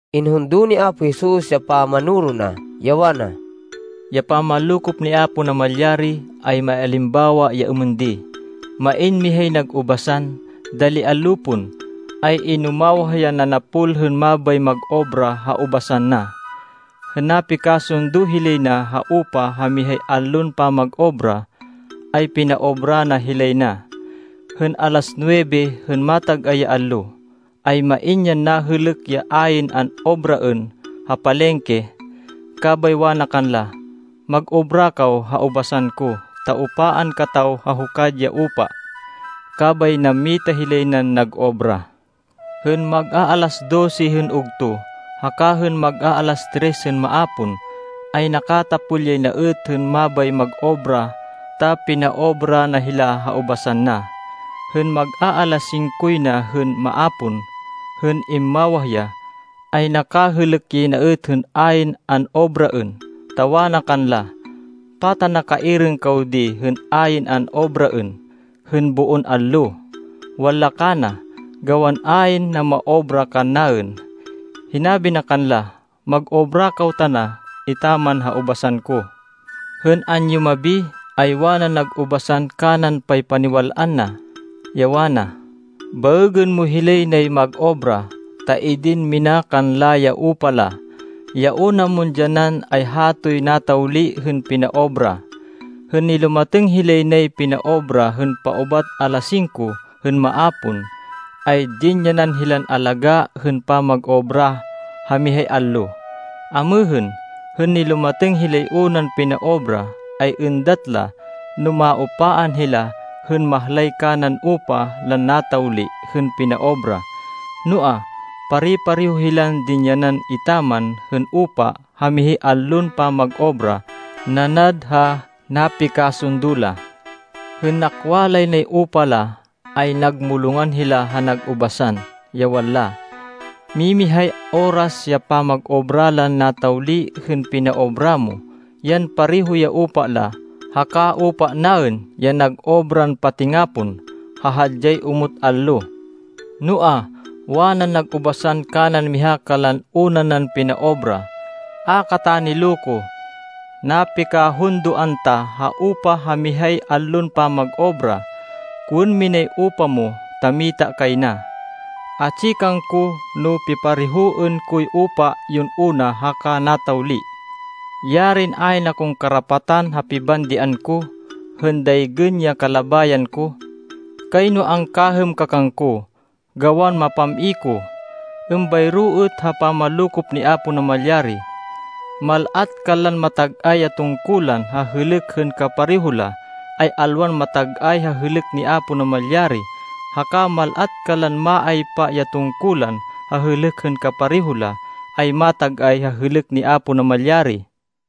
Inhundo ni Apo Jesus ya pamanoro na, ya wana, “Ya pamanlokop ni Apo Namalyari, ay maialimbawa ya êmên di: Main mihay nag ubasan. Dali allo pon, ay inumawah yan nanapol hên mabay mag-obra ha ubasan na. Hên napikasundo hilay na ha upa ha mihay allon pamag-obra, ay pinaobra na hilay na. Hên alas nuwebe hên matag-ay ya allo, ay main yan nahêlêk ya ayn an-obraên ha palengke, kabay wana kanla, ‘Mag-obra kaw ha ubasan ko ta upaan kataw ha hukad ya upa.’ Kabay nammita hilay nan nag-obra. Hên mag-aalas dose hên ugto, haka hên mag-aalas tres hên maapon, ay nakatapol yay na êt hên mabay mag-obra ta pinaobra na hila ha ubasan na. Hên mag-aalas singkoy na hên maapon hên immawah ya, ay nakahêlêk yay na êt hên ayn an-obraên, ta wana kanla, ‘Pata nakaiirêng kaw di hên ayn an-obraên hên boon allo?’ Wanla kana, ‘Gawan ayn namaobra kannaên.’ Hinabi na kanla, ‘Mag-obra kaw tana etaman ha ubasan ko.’ “Hên anyumabi, ay wanan nag ubasan kanan paypaniwal-an na, ya wana, ‘Baêgên mo hilay nay mag-obra, ta idin mina kanla ya upa la. Ya una mon dyanan, ay hatoy natawli hên pinaobra.’ Hên nilumatêng hilay nay pinaobra hên paubat alas singko hên maapon, ay dinyanan hilan alagá hên pamag-obra ha mihay allo. Amêhên, hên nilumatêng hilay unan pinaobra, ay êndat la no maupaan hila hên mahlay kanan upa lan natawli hên pinaobra. Noa, pare-pareho hilan dinyanan etaman hên upa ha mihay allon pamag-obra nanad ha napikasundo la. Hên nakwa lay nay upa la, ay nagmulongan hila ha nag ubasan, ya wanla, ‘Mimihay oras ya pamag-obra lan natawli hên pinaobra mo, yan pareho ya upa la, haka upa naên, ya nag-obran patingapon, ha hadyay omot allo.’ Noa, wanan nag ubasan kanan miha kanlan una nan pinaobra, ‘A kata niloko. Napikahundoan ta ha upa ha mihay allon pamag-obra. Kowên minay upa mo ta mita kay na. Atsi kangko no piparehoên koy upa yon una haka natawli. Yarin ayn akon karapatan ha pibandian ko, hên daygên ya kalabayan ko! Kayno angkahêm ka kangko, gawan mapam-i ko!’ Êmbayro êt ha pamanlokop ni Apo Namalyari. Mal-at kanlan matag-ay ya tungkulan ha hêlêk hên kapareho la, ay alwan matag-ay ha hêlêk ni Apo Namalyari, haka mal-at kanlan maaypa ya tungkulan ha hêlêk hên kapareho la, ay matag-ay ha hêlêk ni Apo Namalyari.”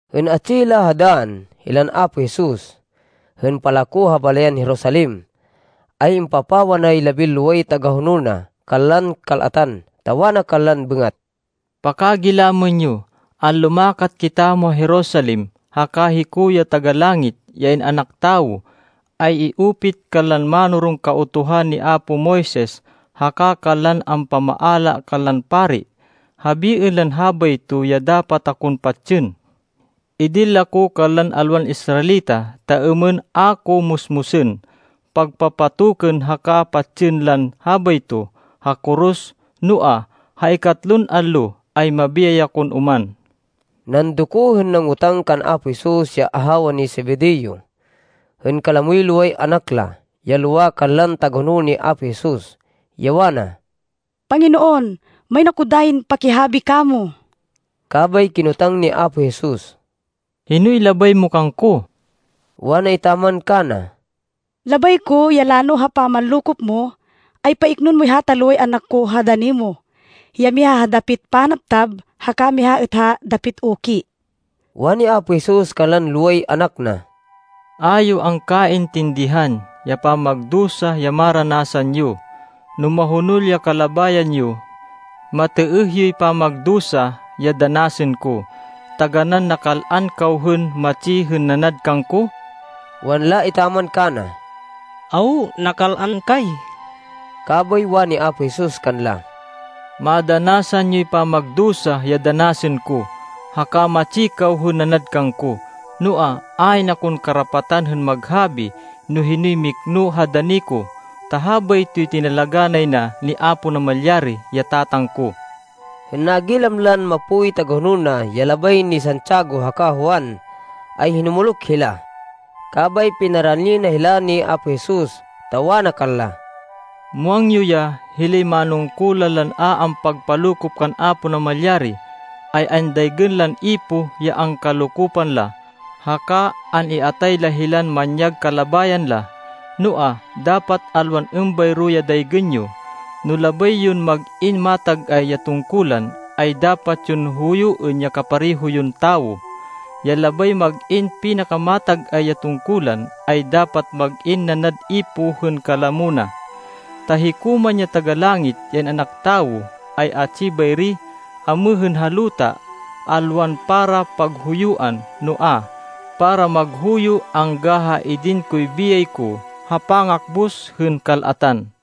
Hên atsi hila ha dann, hilan Apo Jesus, hên palako ha balayan Jerusalem, ay impapawa nay labinloway tagahonol na kanlan kal-atan, ta wana kanlan bêngat, “Pakagilamên yo! Anlumakat kitamo ha Jerusalem, haka hiko, ya Taga-Langit, ya In-anak Tawo, ay i-upit kanlan mánoron Kautuhan ni apo Moises haka kanlan ampamaala kanlan pari. Habiên lan habayto ya dapat akon patsên. Idin la ko kanlan alwan Israelita ta êmên ako musmusên, pagpapatokên haka patsên lan habayto ha koros. Noa, ha ikatlon allo, ay mabiyay kon oman!” Nandoko hên nangotang kan Apo Jesus ya ahawa ni Zebedeo, hên kalamoy loway anak la, ya lowa kanlan tagahonol ni Apo Jesus, ya wana, “Panginoon, main ako dayin pakihabi kamo.” Kabay kinotang ni Apo Jesus, “Hinoy labay mo kangko?” Wana etaman kana, “Labay ko, ya lano ha pamanlokop mo, ay paiknoên moy hata loway anak ko ha dani mo, ya miha ha dapit panabtab, haka miha êt ha dapit uki.” Wani Apo Jesus kanlan loway anak na, “A yo angkaintindihan ya pamagdusa ya maranasan yo, no mahonol ya kalabayan yo. Matêêh yoy pamagdusa ya danasên ko? Taganán nakal-an kaw hên matsi hên nanad kangko?” Wanla etaman kana, “Awo. Nakal-an kay.” Kabay wani Apo Jesus kanla, “Madanasan yoy pamagdusa ya danasên ko, haka matsi kaw hên nanad kangko. Noa, ayn akon karapatan hên maghabi no hinoy mikno ha dani ko, ta habaytoy tinalagá nay na ni Apo Namalyari ya Tatang ko.” Hên nagilam lan mapoy tagahonol na, ya labay ni Santiago haka Juan, ay hinumuluk hila. Kabay pinarani na hila ni Apo Jesus, ta wana kanla, “Muwang yo ya hilay manungkulan lan a ampagpalokop kan Apo Namalyari, ay andaygên lan ipoh ya angkalokopan la, haka an-iatay la hilan manyag kalabayan la. Noa, dapat alwan êmbayro ya daygên yo. No labay yon mag-in matag-ay ya tungkulan, ay dapat yon huyuên ya kapareho yon tawo. Ya labay mag-in pinakamatag-ay ya tungkulan, ay dapat mag-in nanad ipoh hên kalamo na. Ta hiko man ya Taga-Langit, ya In-anak Tawo, ay atsi bayri amêhên ha luta, alwan para paghuyuan, noa, para maghuyo angga ha idin koy biyay ko, ha pangakbus hên kal-atan.”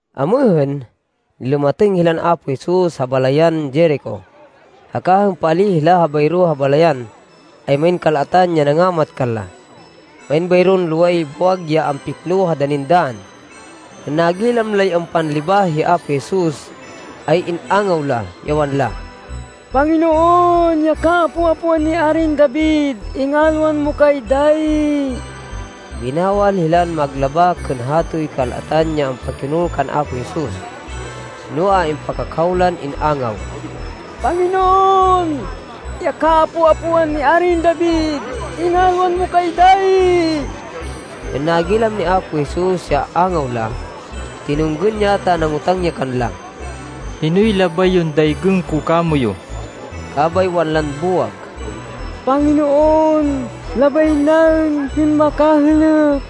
Amêhên, nilumatêng hilan Apo Jesus ha balayan Jerico. Haka hên paalíh hila bayro ha balayan, ay main kal-atan ya nangamat kanla. Main bayron loway buwag ya ampikno ha danin dann. Hên nagilam lay ampanlibah hi Apo Jesus ay in-angaw la, ya wanla, “Panginoon, ya kaapo-apoan ni Arin David, ingalwan mo kay dayi!” Binawal hilan maglabak hên hatoy kal-atan ya ampakihonol kan Apo Jesus, noa, impakakhaw lan in-angaw, “Panginoon, ya kaapo-apoan ni Arin David, ingalwan mo kay dayi!” Hên nagilam ni Apo Jesus ya angaw la, tinunggên ya ta nangotang ya kanla, “Hinoy labay yon daygên ko kamoyu?” Kabay wanlan buwag, “Panginoon, labay naên hên makahêlêk.”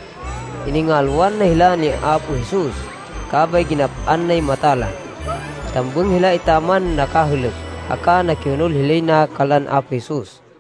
Iningalwan na hila ni Apo Jesus, kabay ginap-an nay mata la. Tambêng hila etaman nakahêlêk, haka nakihonol hilay na kanlan Apo Jesus.